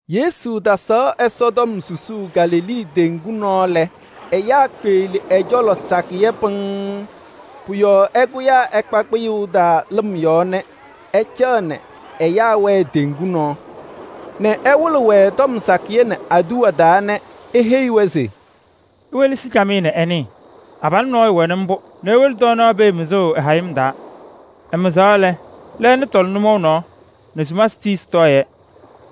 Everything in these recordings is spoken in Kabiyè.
Yesu tasaɣ Ɛsɔtɔm susuu Galilee teŋgu nɔɔ lɛ, ɛyaa kpeɣli ɛ-cɔlɔ sakɩyɛ pɩŋŋ. Pʋ-yɔɔ ɛkʋyaa ɛkpa kpɩyʋʋ taa lɩm yɔɔ nɛ ɛcaɣ nɛ ɛyaa wɛɛ teŋgu nɔɔ nɛ ɛwɩlɩ-wɛ tɔm sakɩyɛ nɛ aduwa taa nɛ eheyi-wɛ se: “Iwelesi camɩyɛ nɛ ɩnɩɩ: abalʋ nɔɔyʋ wɛnɩ mbʋ nɛ ewolo tɔɔnaɣ pee mɩzʋʋ ɛ-hayɩm taa. Ɛmɩzaɣ lɛ, lɛɛna tɔlɩ nʋmɔʋ nɔɔ nɛ sumasɩ tii sɩtɔɔ-yɛ.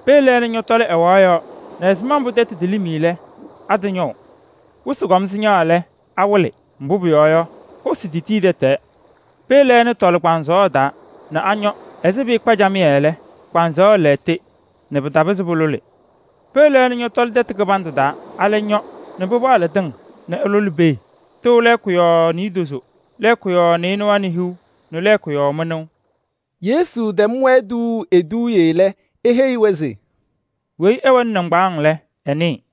Pee lɛɛna ñɔtɔlɩ ɛwaɣ yɔɔ nɛ ɛzɩma mbʋ tɛtʋ telim lɛ, atɩñɔʋ. Wɩsɩ kɔm sɩñaɣ lɛ, pɩwɩlɩ. Mbʋ pʋyɔɔ yɔ, hosi tetii tɛtɛɛ. Pee lɛɛna tɔlɩ kpaŋsɔɔ taa nɛ añɔ ɛzɩ pɩɩkpa camɩyɛ lɛ, kpaŋsɔɔ lɛɣtɩ nɛ pɩtapɩzɩ lʋlʋʋ. Pee lɛɛna ñɔtɔlɩ tɛtʋ kɩbandʋ taa, alɛ ñɔ nɛ pɩpaɣlɩ tɩŋ nɛ ɩlʋlɩ pee. Tɩʋ lɛɛkʋ yɔɔ niidozo, lɛɛkʋ yɔɔ nɩɩnʋwa nɛ hiu nɛ lɛɛkʋ yɔɔ mɩnʋʋ.” Yesu tɛm-wɛ tuuu eduuye lɛ, eheyi-wɛ se: “Weyi ɛwɛnɩ nɩŋgbaaŋ lɛ, ɛnɩɩ.”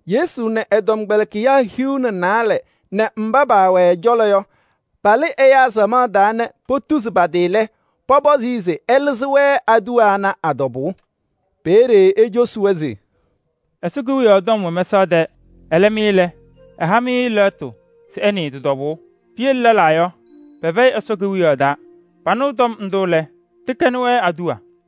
Yesu nɛ ɛ-tɔmkpɛlɩkɩyaa hiu nɛ naalɛ nɛ mba paawɛ ɛ-cɔlɔ yɔ, palɩ ɛyaa samaɣ taa nɛ potuzi pa-tɩ lɛ, pɔpɔzɩ-ɩ se ɛlɩzɩ-wɛ aduwa ana a-tɔbʋʋ. Peeye ecosi-wɛ se: “Ɛsɔ Kewiyaɣ tɔm wɛ mɛsaɣ tɛɛ. Ɛlɛ mɩ lɛ, ɛha-mɩ lɛɣtʋ se ɩnɩɩ tɩ-tɔbʋʋ. Piyele lɛlaa yɔ, pɛfɛyɩ Ɛsɔ Kewiyaɣ taa. Panɩɣ tɔm ndʋ lɛ, tɩkɛnɩ-wɛ aduwa.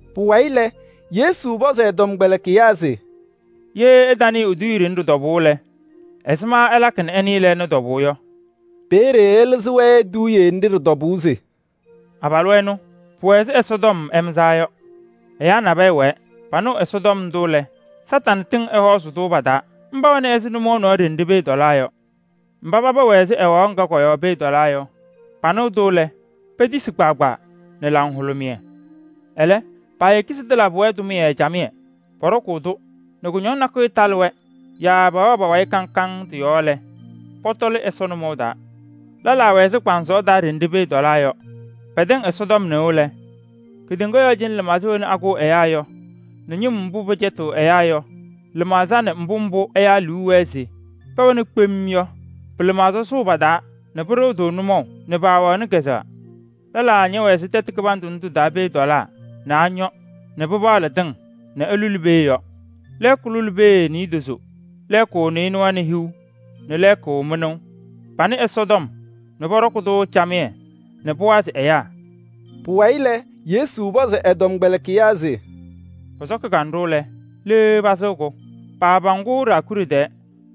Pʋwayɩ lɛ, Yesu pɔzɩ ɛ-tɔmkpɛlɩkɩyaa se: “Ye ɩtanɩɩ eduuye ɖɩnɛ ɖɩ-tɔbʋʋ lɛ, ɛzɩma ɩlakɩ nɛ ɩnɩɩ lɛɛna tɔbʋʋ yɔ?” Peeye ɛlɩzɩ-wɛ eduuye nɖɩ ɖɩ-tɔbʋʋ se: “Abalʋ ɛnʋ, pʋwɛ ɛzɩ Ɛsɔtɔm ɛmɩzaa yɔ. Ɛyaa nabɛyɛ wɛɛ, panɩɣ Ɛsɔtɔm ndʋ lɛ, Kañadʋ Satanɩ tɩŋ ɛhɔɔzɩ-tʋ pa-taa. Mba wɛna ɛzɩ nʋmɔʋ nɔɔ ɖenɖe pee tɔlaa yɔ. Mba paba wɛ ɛzɩ ɛwaɣ ŋga kɔ-yɔɔ pee tɔlaa yɔ, panɩɣ-tʋ lɛ, petisi kpaagbaa nɛ laŋhʋlʋmɩyɛ. Ɛlɛ, paayeki se tɩlabɩ-wɛ tʋmɩyɛ camɩyɛ. Pɔɖɔkʋʋ-tʋ nɛ kʋñɔŋ nakʋyʋ talɩ-wɛ yaa pɛwɛɛ pa-wayɩ kaŋ kaŋ tɩ-yɔɔ lɛ, pɔtɔlɩ Ɛsɔ nʋmɔʋ taa. Lɛlaa wɛ ɛzɩ kpaŋsɔɔ taa ɖenɖe pee tɔlaa yɔ. Pɛtɛŋ Ɛsɔtɔm nɩʋ lɛ, kedeŋa yɔɔ cɩnɛ lɩmaɣza wena akʋʋ ɛyaa yɔ nɛ ñɩm mbʋ pɩcɛtɩɣ ɛyaa yɔ pɩ-lɩmaɣza nɛ mbʋ mbʋ ɛyaa liu wɛɛ se pɛwɛna kpem yɔ pɩ-lɩmaɣza sʋʋ pa-taa nɛ pɩɖɩɣ-tʋ nʋmɔʋ nɛ paawɛɣnɩ kazʋwa. Lɛlaa ñɛwɛ ɛzɩ tɛtʋ kɩbandʋ ndʋ tɩ-taa pee tɔlaa nɛ añɔ nɛ pɩpaɣlɩ tɩŋ nɛ ɩlʋlɩ pee yɔ: lɛɛkʋ lʋlɩ pee niidozo, lɛɛkʋ nɩɩnʋwa nɛ hiu nɛ lɛɛkʋ mɩnʋʋ. Panɩ Ɛsɔtɔm nɛ pɔɖɔkɩ-tʋ camɩyɛ nɛ pʋwazɩ ɛyaa.” Pʋwayɩ lɛ, Yesu pɔzɩ ɛ-tɔmkpɛlɩkɩyaa se: “Pɔsɔkɩ kanɖʋ lɛ, le pasɩɣ-kʋ? Paapaŋ-kʋ ɖaakuɖe tɛɛ.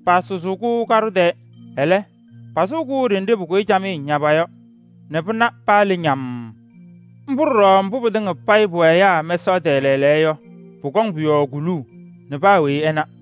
Paasʋzʋʋ-kʋ kaɖʋ tɛɛ. Ɛlɛ, pasɩɣ-kʋ ɖenɖe pʋkʋyɩ camɩyɛ ñaba yɔ nɛ pɩna paa le ñamm. Mbʋ ɖɔɖɔ mbʋ pɩtɩŋa payɩ pʋwɛ ɛyaa mɛsaɣ tɛɛ lɛɛlɛɛyɔ yɔ, pʋkɔŋ pʋ-yɔɔ kuluu nɛ paa weyi ɛna.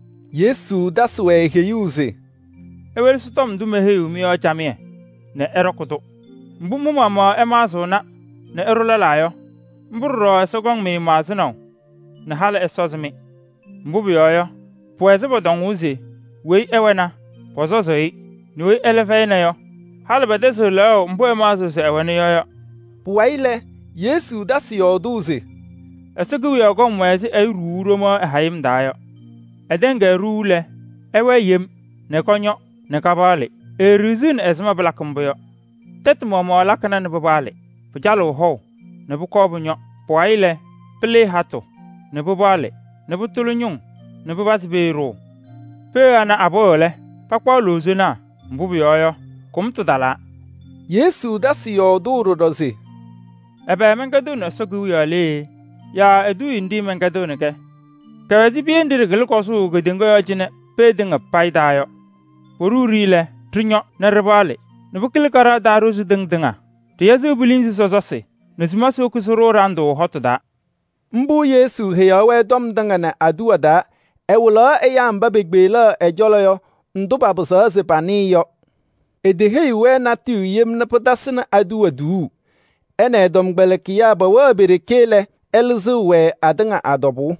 Yesu tasɩ-wɛ heyuu se: “Iwelesi tɔm ndʋ meheyiɣ-mɩ yɔ camɩyɛ nɛ ɩɖɔkɩ-tʋ. Mbʋ mɩ-maɣmaɣ ɩmaɣzɩɣna nɛ ɩɖʋʋ lɛlaa yɔ, mbʋ ɖɔɖɔ Ɛsɔ kɔŋ-mɩ maɣzɩnaʋ nɛ halɩ ɛsɔzɩ-mɩ. Mbʋ pʋyɔɔ yɔ, pʋwɛ ɛzɩ pɔtɔŋʋʋ se: ‘Weyi ɛwɛna, pɔsɔzɩ-ɩ nɛ weyi ɛlɛ fɛyɩna yɔ, halɩ pɛtɛzɩɣ lɛɣʋ mbʋ ɛmaɣzɩɣ se ɛwɛna yɔ’ yɔ.” Pʋwayɩ lɛ, Yesu tasɩ yɔɔdʋʋ se: “Ɛsɔ Kewiyaɣ kɔm wɛ ɛzɩ ɛyʋ ɖuuu ɖomaɣ ɛ-hayɩm taa yɔ. Ɛtɛŋ-kɛ ɖuu lɛ, ɛwɛɛ yem nɛ kɔñɔ nɛ kapaɣlɩɣ. Eeɖiɣziɣni ɛzɩma mbʋ pɩlakɩ mbʋ yɔ. Tɛtʋ maɣmaɣ lakɩna nɛ pɩpaɣlɩ. Pɩcalɩɣnɩ hɔʋ nɛ pʋkɔɔ pʋñɔ. Pʋwayɩ lɛ, pɩlɩɩ hatʋ nɛ pɩpaɣlɩ nɛ pʋtʋlɩ ñʋŋ nɛ pɩpazɩ pee ɖʋʋ. Pee ana apɩɣ lɛ, pakpaɣ loozonaa. Mbʋ pʋyɔɔ yɔ, kʋmtʋ talaa.” Yesu tasɩ yɔɔdʋʋ ɖɔɖɔ se: “Ɛbɛ mɛnkɛdɩɣnɩ Ɛsɔ Kewiyaɣ lee yaa eduuye nɖɩ mɛnkɛdɩɣnɩ-kɛ? Kɛwɛ ɛzɩ piye nɖɩ ɖɩkɩlɩ kɔzʋʋ kedeŋa yɔɔ cɩnɛ pee tɩŋa payɩ taa yɔ. Poɖuu-ɖɩ lɛ, ɖɩñɔ nɛ pɩpaɣlɩ nɛ pɩkɩlɩ kaɖaɣ taa ɖozi tɩŋ tɩŋa. Pɩyɛzɩɣ pilinzi sɔsɔsɩ nɛ sumasɩ woki sɩɖʋʋ ɖandʋ hɔtʋ taa.” Mbʋ Yesu heyaɣ-wɛ tɔm tɩŋa nɛ aduwa taa. Ɛwɩlaɣ ɛyaa mba pekpeɣli ɛ-cɔlɔ yɔ ndʋ papɩzaɣ se panɩɩ yɔ. Eteheyiɣ-wɛ natʋyʋ yem nɛ pɩtasɩnɩ aduwa tuuu. Ɛ nɛ ɛ-tɔmkpɛlɩkɩyaa pɛwɛɣ pe-ɖeke lɛ, ɛlɩzɩɣ-wɛ atɩŋa a-tɔbʋʋ.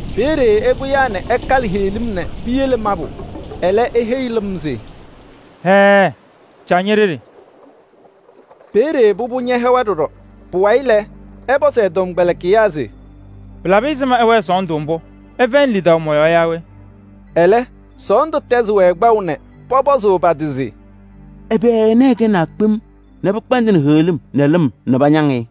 Peeye ɛkʋyaa nɛ ɛkalɩ heɣlim nɛ piyele mabʋ. Ɛlɛ eheyi lɩm se: “Hɛɛ! Caɣ ñe-ɖeɖe.” Peeye pʋbʋ ñɛhɛwa ɖɔɖɔ. Pʋwayɩ lɛ, ɛpɔzɩ ɛ-tɔmkpɛlɩkɩyaa se: “Pɩlabɩ ɛzɩma ɩwɛɛ sɔɔndʋ mbʋ? Ɩfɛyɩnɩ lidaʋ mɔ-yɔɔ yaa we?” Ɛlɛ, sɔɔndʋ tɛzɩ-wɛ kpaʋ nɛ pɔpɔzʋʋ pa-tɩ se: “Ɛbɛ ɛnɛ ɛkɛnaa kpem nɛ pɩkpɛndɩnɩ heɣlim nɛ lɩm nɛ pañaŋ-ɩ?”